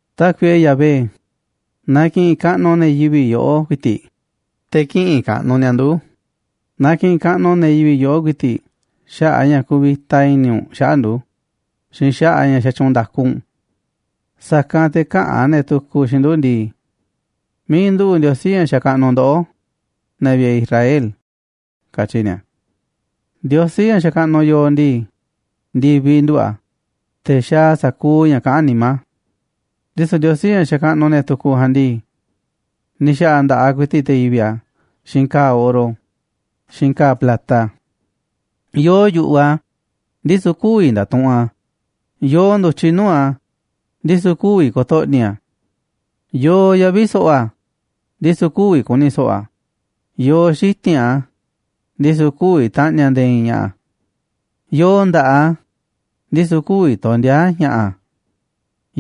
Tákuiꞌe Yahvé, na ki̱ꞌi̱n kaꞌnuꞌ ne̱ yivi̱ꞌ yoꞌó ku̱i̱ti̱ꞌ, te̱ kï̱ꞌi̱n kaꞌnuꞌ ni̱a̱ nduꞌu̱, na ki̱ꞌi̱n kaꞌnuꞌ ne̱ yivi̱ꞌ yoꞌó ku̱i̱ti̱ꞌ xaꞌa̱ꞌ a̱ ña̱ kuvita i̱ni̱ u̱nꞌ xaꞌa̱ꞌ ndu̱ xiinꞌ xaꞌa̱ꞌ a̱ ña̱ xatyuunꞌ nda̱ku u̱nꞌ. Sa̱kanꞌ te̱ käꞌa̱n ne̱ tukuꞌ xiinꞌ ndu̱ ndii: “¿Miiꞌ nduꞌu̱ꞌ Ndiosí ña̱ xakaꞌnuꞌ ndoꞌó, ne̱ vi̱ꞌe̱ Israel?”, katyi̱ ni̱a̱. Ndiosí ña̱ xakaꞌnuꞌ yooꞌ ndii, ndi̱viꞌ nduꞌu̱ꞌ a̱, te̱ xaaꞌ a̱ sa̱kuuꞌ ña̱ kaꞌán nimá a̱. Ndisu̱ ndiosí ña̱ xakaꞌnuꞌ ne̱ tukuꞌ ja̱a̱nꞌ ndii, ni̱ xa̱ꞌa̱ nda̱ꞌaꞌ ku̱i̱ti̱ꞌ te̱ yivi̱ꞌ a̱ xiinꞌ ka̱a̱ oro xiinꞌ ka̱a̱ plata. Yoo yu̱ꞌuꞌ a̱, ndisu̱ kü̱vi̱ nda̱tuꞌunꞌ a̱, yoo ndu̱tyiꞌ nuu̱ꞌ a̱, ndisu̱ kü̱vi̱ ko̱to̱ꞌni̱ a̱. Yoo yavi̱ so̱ꞌo̱ a̱, ndisu̱ kü̱vi̱ ku̱ni̱ so̱ꞌo̱ a̱, yoo xiti̱nꞌ a̱, ndisu̱ kü̱vi̱ ta̱ꞌni̱ a̱ nde̱e̱ i̱i̱n ña̱ꞌa̱. Yoo nda̱ꞌaꞌ a̱, ndisu̱ kü̱vi̱ tondi̱a̱ a̱ ña̱ꞌa̱,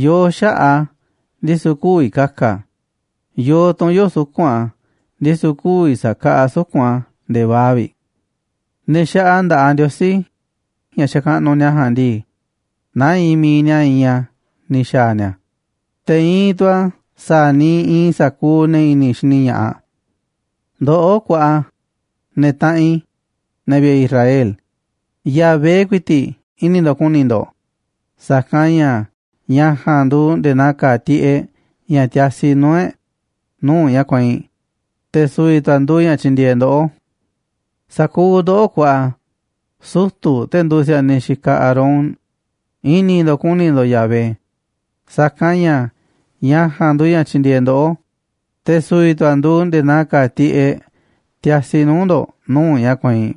yoo xaꞌa̱ꞌ a̱, ndisu̱ kü̱vi̱ ka̱ka̱ a̱, yoo tu̱nyoo̱ꞌ suku̱nꞌ a̱, ndisu̱ kü̱vi̱ sa̱kaꞌaꞌ a̱ suku̱nꞌ a̱ nde̱e̱ vaa̱ꞌ vi̱ꞌ. Ne̱ xaꞌa nda̱ꞌaꞌ ndiosí ña̱ xakaꞌnuꞌ ni̱a̱ ja̱a̱nꞌ ndii, naa iinꞌ mi̱iꞌ ni̱a̱ iinꞌ a̱ ni̱ xa̱a̱ ni̱a̱, te̱ iinꞌ tu̱ a̱ sa̱a̱ niiꞌ iinꞌ sa̱kuuꞌ ne̱ i̱ni̱ xini ña̱ꞌaꞌ. Ndoꞌó kuaꞌa, ne̱ taꞌanꞌ i̱, ne̱ vi̱ꞌe̱ Israel, Yahvé ku̱i̱ti̱ꞌ i̱ni̱ ndo̱ꞌ ku̱ni̱ ndo̱ꞌ, sa̱kanꞌ ña̱ ña̱ ja̱a̱nꞌ nduuꞌ nde̱e̱ naa ka̱a̱ tiꞌeꞌ ña̱ tiasi nuu̱ꞌ e̱ꞌ nuu̱ꞌ ña̱ kueinꞌ, te̱ su̱vi̱ tu̱ a̱ nduuꞌ ña̱ tyindieeꞌ ndoꞌó. Sa̱kuuꞌ ndoꞌó, kuaꞌa sutu̱, te̱ nduuꞌ si̱a̱niꞌ xikaꞌ Aarón, i̱ni̱ ndo̱ꞌ ku̱ni̱ ndo̱ꞌ Yahvé, sa̱kanꞌ ña̱ ña̱ ja̱a̱nꞌ nduuꞌ ña̱ tyindieeꞌ ndoꞌó, te̱ su̱vi̱ tu̱ a̱ nduuꞌ nde̱e̱ naa ka̱a̱ tiꞌeꞌ tiasi nuu̱ꞌ ndo̱ꞌ nuu̱ꞌ ña̱ kueinꞌ.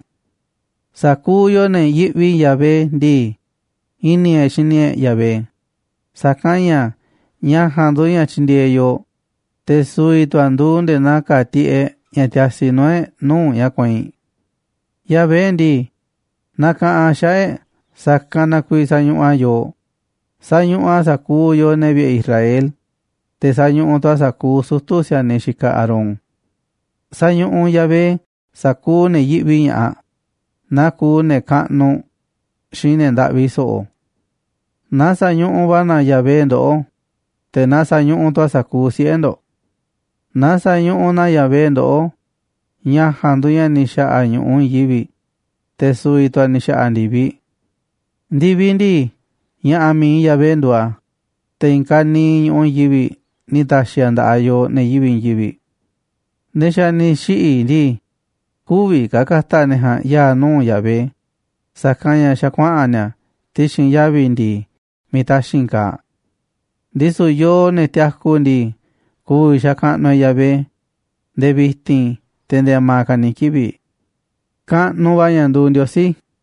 Sa̱kuuꞌ yooꞌ, ne̱ yiꞌvi Yahvé ndii, i̱ni̱ e̱ꞌ xini e̱ꞌ Yahvé, sa̱kanꞌ ña̱ ña̱ ja̱a̱nꞌ nduuꞌ ña̱ tyindieeꞌ yooꞌ, te̱ su̱vi̱ tu̱ a̱ nduuꞌ nde̱e̱ na̱a̱ ka̱a̱ tiꞌeꞌ ña̱ tiasi nuu̱ꞌ e̱ꞌ nuu̱ꞌ ña̱ kueinꞌ. Yahvé ndii, nakaꞌanꞌ a̱ xaꞌa̱ꞌ e̱ꞌ sa̱kanꞌ na kuiiꞌ sañuꞌuꞌ a̱ yooꞌ, sañuꞌuꞌ a̱ sa̱kuuꞌ yooꞌ, ne̱ vi̱ꞌe̱ Israel, te̱ sañuꞌuꞌ tu̱ a̱ sa̱kuuꞌ sutu̱ si̱a̱niꞌ xikaꞌ Aarón. Sa̱ñuꞌuꞌ Yahvé sa̱kuuꞌ ne̱ yiꞌvi ña̱ꞌaꞌ, naa kuuꞌ ne̱ kaꞌnuꞌ xiinꞌ ne̱ ndaꞌvi so̱ꞌo̱. Na sa̱ñuꞌuꞌ va̱ na Yahvé ndoꞌó, te̱ naa sa̱ñuꞌuꞌ tu̱ a̱ sa̱kuuꞌ siꞌe̱ ndo̱ꞌ. Na sa̱ñuꞌuꞌ na Yahvé ndoꞌó, ña̱ ja̱a̱nꞌ nduuꞌ ña̱ ni̱ xa̱ꞌa̱ ñu̱ꞌuꞌ i̱i̱n yivi̱ꞌ, te̱ su̱vi̱ tu̱ a̱ ni̱ xa̱ꞌa̱ ndi̱viꞌ. Ndi̱viꞌ ndii, ña̱ꞌa̱ mi̱iꞌ Yahvé nduuꞌ a̱, te̱ i̱i̱n ka̱niiꞌ ñu̱ꞌuꞌ i̱i̱n yivi̱ꞌ ni̱ ta̱xi̱ a̱ nda̱ꞌaꞌ yooꞌ, ne̱ yivi̱ꞌ i̱i̱n yivi̱ꞌ. Ne̱ xa̱ ni̱ xiꞌi̱ ndii, kü̱vi̱ ka̱ ka̱ta̱ ne̱ ja̱a̱nꞌ ya̱a̱ nuu̱ꞌ Yahvé, sa̱kanꞌ ña̱ xa̱ kuaꞌa̱n ni̱a̱ ti̱xi̱n yavi̱ ndi̱i̱ miiꞌ taxi̱nꞌ kaaꞌ. Ndisu̱ yooꞌ, ne̱ tiaku ndii, ku̱vi̱ xakaꞌnuꞌ e̱ꞌ Yahvé nde̱e̱ vi̱ti̱n, te̱ nde̱e̱ a̱ma̱ ka̱ ni̱ kivi̱ꞌ. Kaꞌnuꞌ va̱ ña̱ nduuꞌ Ndiosí.